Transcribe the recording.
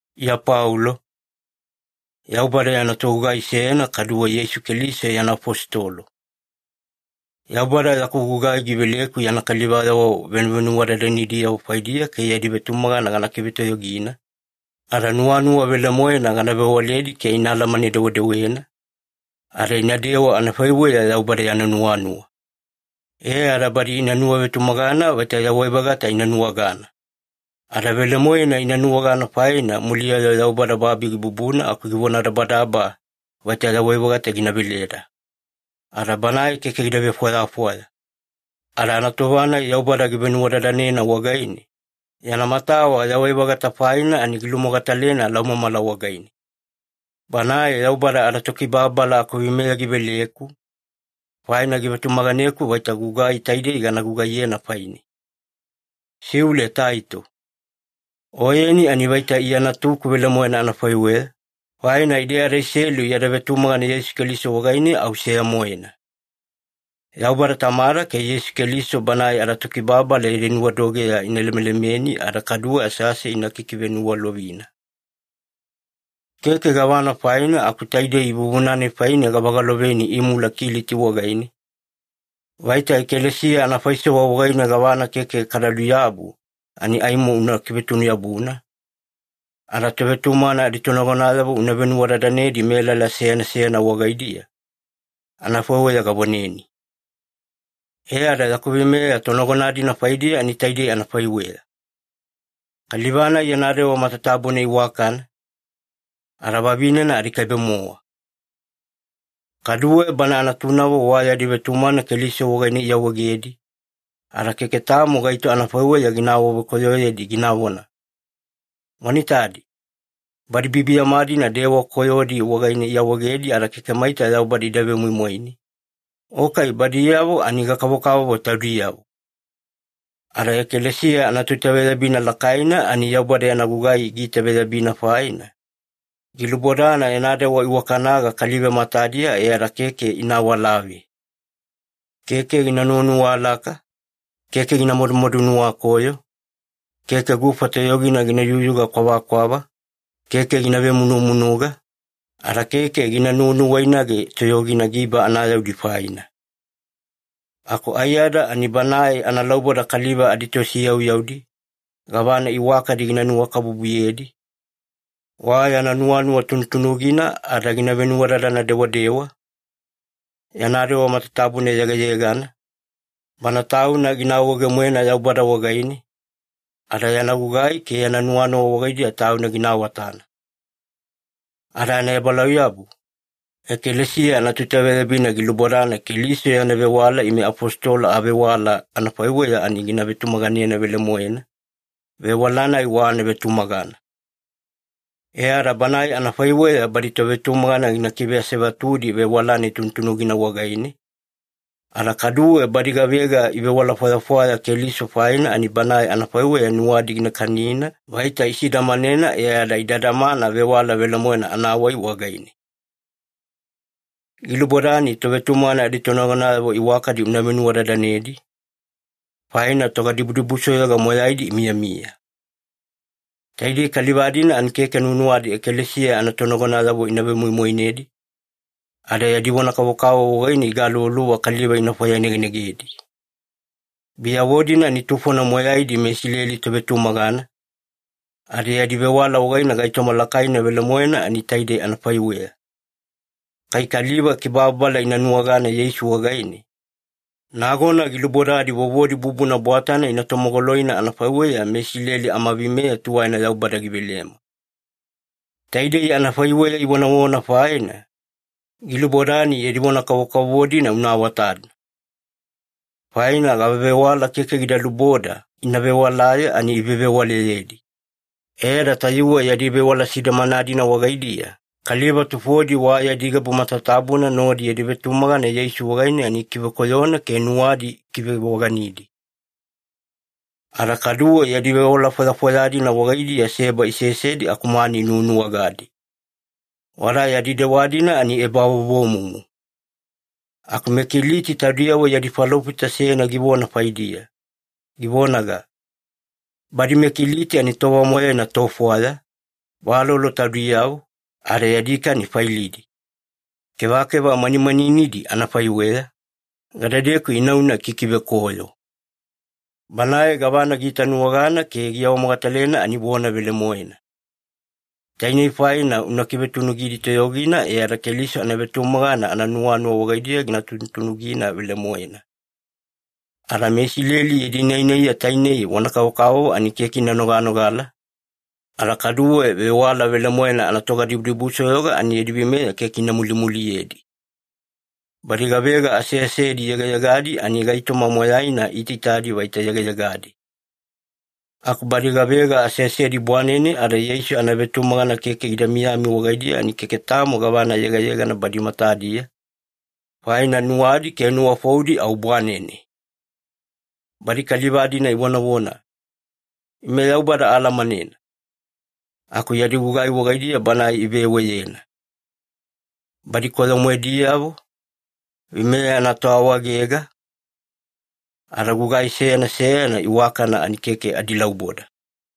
Iya Paulo, Yaubada yana togugai seyana kaduwe Yeisu Keliso yana afositolo. Yaubada yaku gugai giveleku yana kalivayavo venuvenuwadadanediyavo faidiya ke yadi vetumagana gana kivetoyogina, ada nuwanuwa velemoena gana vewaledi ke ina alamane-dewedewena, ada inadewa anafaiweya Yaubada yana nuwanuwa. E ada badi ina nuwavetumagana vaita yawai-vagata ina nuwagana. Ada velemoena ina nuwagana faina muliya-yo Yaubada babi gibubuna aku givonadabadaba vaita yawai-vagata gina veleda. Ada Banae keke gida vefwayafwaya. Ada anatova-nai Yaubada givenuwadadanena wagaine, yana matawa yawai-vagata faina ani gilumogatalena laumamala wagaine. Banae Yaubada adaTokibababala akuveimeya giveleku, faina givetumaganeku vaita gugai taidei gana gugaiyena faine. Siule Taito. Oyeni ani vaita Iya natuku velemoena anafaiweya, faina ide adaiselu yada vetumagana Yeisu Keliso wagaine au seya-moena. Yaubada Tamada ke Yeisu Keliso Banae adaTokibababala yadi nuwadogeya ina lemelemeni ada kaduwe asease ina kikiveniwalovina. Keke gavana faina aku taidei vuvuna-nai faine gavagaloveni imula Kiliti wagaine, vaita ekalesiya anafaisewa wagaine gavana keke kada luyabu ani aimo una kivetunu-yabuna, ada tovetumagana aditonagonayavo una venuwadadanedi melala seyana seyana wagaidiya, anafaiweya gavoneni. E ada yaku veimeya tonagona-dina faidiya ani taidei anafaiweya. Kaliva-nai yana dewa matatabuna iwakana, ada vavinena adikaibe-mowa. Kaduwe bana natunavo wa yadi vetumagana Keliso wagaine iawaegedi, ada keke tamo gaito anafaiweya gina awavekoyoyedi ginavona, “Wana itadi, badi biyabiyama-dina dewa koyodi wagaine iawaegedi ada keke maita Yaubada ida vemoimoine,” o kai “Badiyavo ani gakavokavovo taudiyavo.” Ada ekalesiya anatoitaveyabina lakaina ani Yaubada yana gugai giitaveyabina faina, gilubodana yana dewa iwakanaga kaliva matadiya e ada keke ina awalave. Keke gina nuwanuwalaka, keke gina madumadu nuwakoyo, keke gufa toyogina gina yuyuga kwavakwava, keke gina vemunumunuga, ada keke gina nuwanuwainage toyogina giba anayaudi faina. Aku aiyada ani banae analauboda kaliva aditosiyauyaudi, gavana iwakadi gina nuwakabubuyedi, wa yana nuwanuwa tunutunugina ada gina venuwadadana dewadewa, yana dewa matatabuna yegayegana, bana tauna gina awaege-moena Yaubada wagaine, ada yana gugai ke yana nuwanuwa wagaidiya tauna gina awatana. Ada anaebalauyabu, ekalesiya anatoitaveyabina gilubodana Keliso yana vewala ime afositolo avewala anafaiweya ani gina vetumaganena velemoena, vewala-nai wa anavetumagana. E ada banae anafaiweya badi tovetumagana gina kiveasevatudi vewala-nai tunutunugina wagaine, ada kaduwe badi gavega ivewala fwayafwaya Keliso faina, ani banae anafaiweya nuwadi gina kanina vaita isidamanena e ada ida damana vewala velemoena anawai wagaine. Gilubodani tovetumagana aditonagonayavo iwakadi una venuwadadanedi, faina togadibudibusoyoga moyaidi imiyamiya. Taidei kaliva-dina ani keke nuwanuwadi ekalesiya anatonagonayavo ina vemoimoinedi, ada yadi vona kavokavovo wagaine igaluvaluva kaliva ina fwayanegenegedi. Biyavo-dina ani tufona moyaidi meIsileli tovetumagana, ada yadi vewala wagaine gaitoma lakaina velemoena ani taidei anafaiweya. Kai kaliva kibababala ina nuwagana Yeisu wagaine, nagona gilubodadi vovodi bubuna bwatana ina tomogoloina anafaiweya meIsileli amaveimeya tuwaina Yaubada givelema. Taidei anafaiweya ivonavona faina, gilubodani yadi vona kavokavovo-dina una awatana. Faina gavavewala keke gida luboda ina vewalaye ani ivevewalayedi, e ada tayuwe yadi vewala sidamana-dina wagaidiya, kaliva tufodi wa yadi gabu matatabuna nodi yadi vetumagana Yeisu wagaine ani ikivekoyona ke nuwadi ikivevoganidi. Ada kaduwe yadi vewala fwayafwaya-dina wagaidiya seba isesedi aku mani inuwanuwagadi. Wada yadi dewa-dina ani ebavovomumu. Aku meKiliti taudiyavo yadi falofita seyana givona faidiya, givonaga, “Badi meKiliti ani tova moyaina tofwaya, valolo taudiyavo, ada yadi kani failidi. Kevakeva manimaninidi anafaiweya, gadedeku inauna ikikivekoyo.” Banae gavana giitanuwagana ke giawamogatalena ani vona velemoena. Tainei faina una kivetunugidi toyogina e ada Keliso anavetumagana ananuwanuwa wagaidiya gina tunutunugina velemoena. Ada meIsileli yadi nainaiya tainei vona kavokavovo ani keke ina noganogala, ada kaduwe vewala velemoena anatogadibudibusoyoga ani yadi veimeya keke ina mulimuliyedi. Badi gavega aseasedi yegayegadi ani gaitoma moyaina iitaitadi vaita yegayegadi. Aku badi gavega aseasedi bwanene ada Yeisu anavetumagana keke gida miyami wagaidiya ani keke tamo gavana yegayegana badi matadiya, faina nuwadi ke nuwafoudi au bwanene. Badi kaliva-dina ivonavona, “Ime Yaubada aalamanena,” aku yadi gugai wagaidiya Banae iveweyena. Badi koyo-moediyavo, veimeya anatoawaegega, ada gugai seyana seyana iwakana ani keke adilauboda.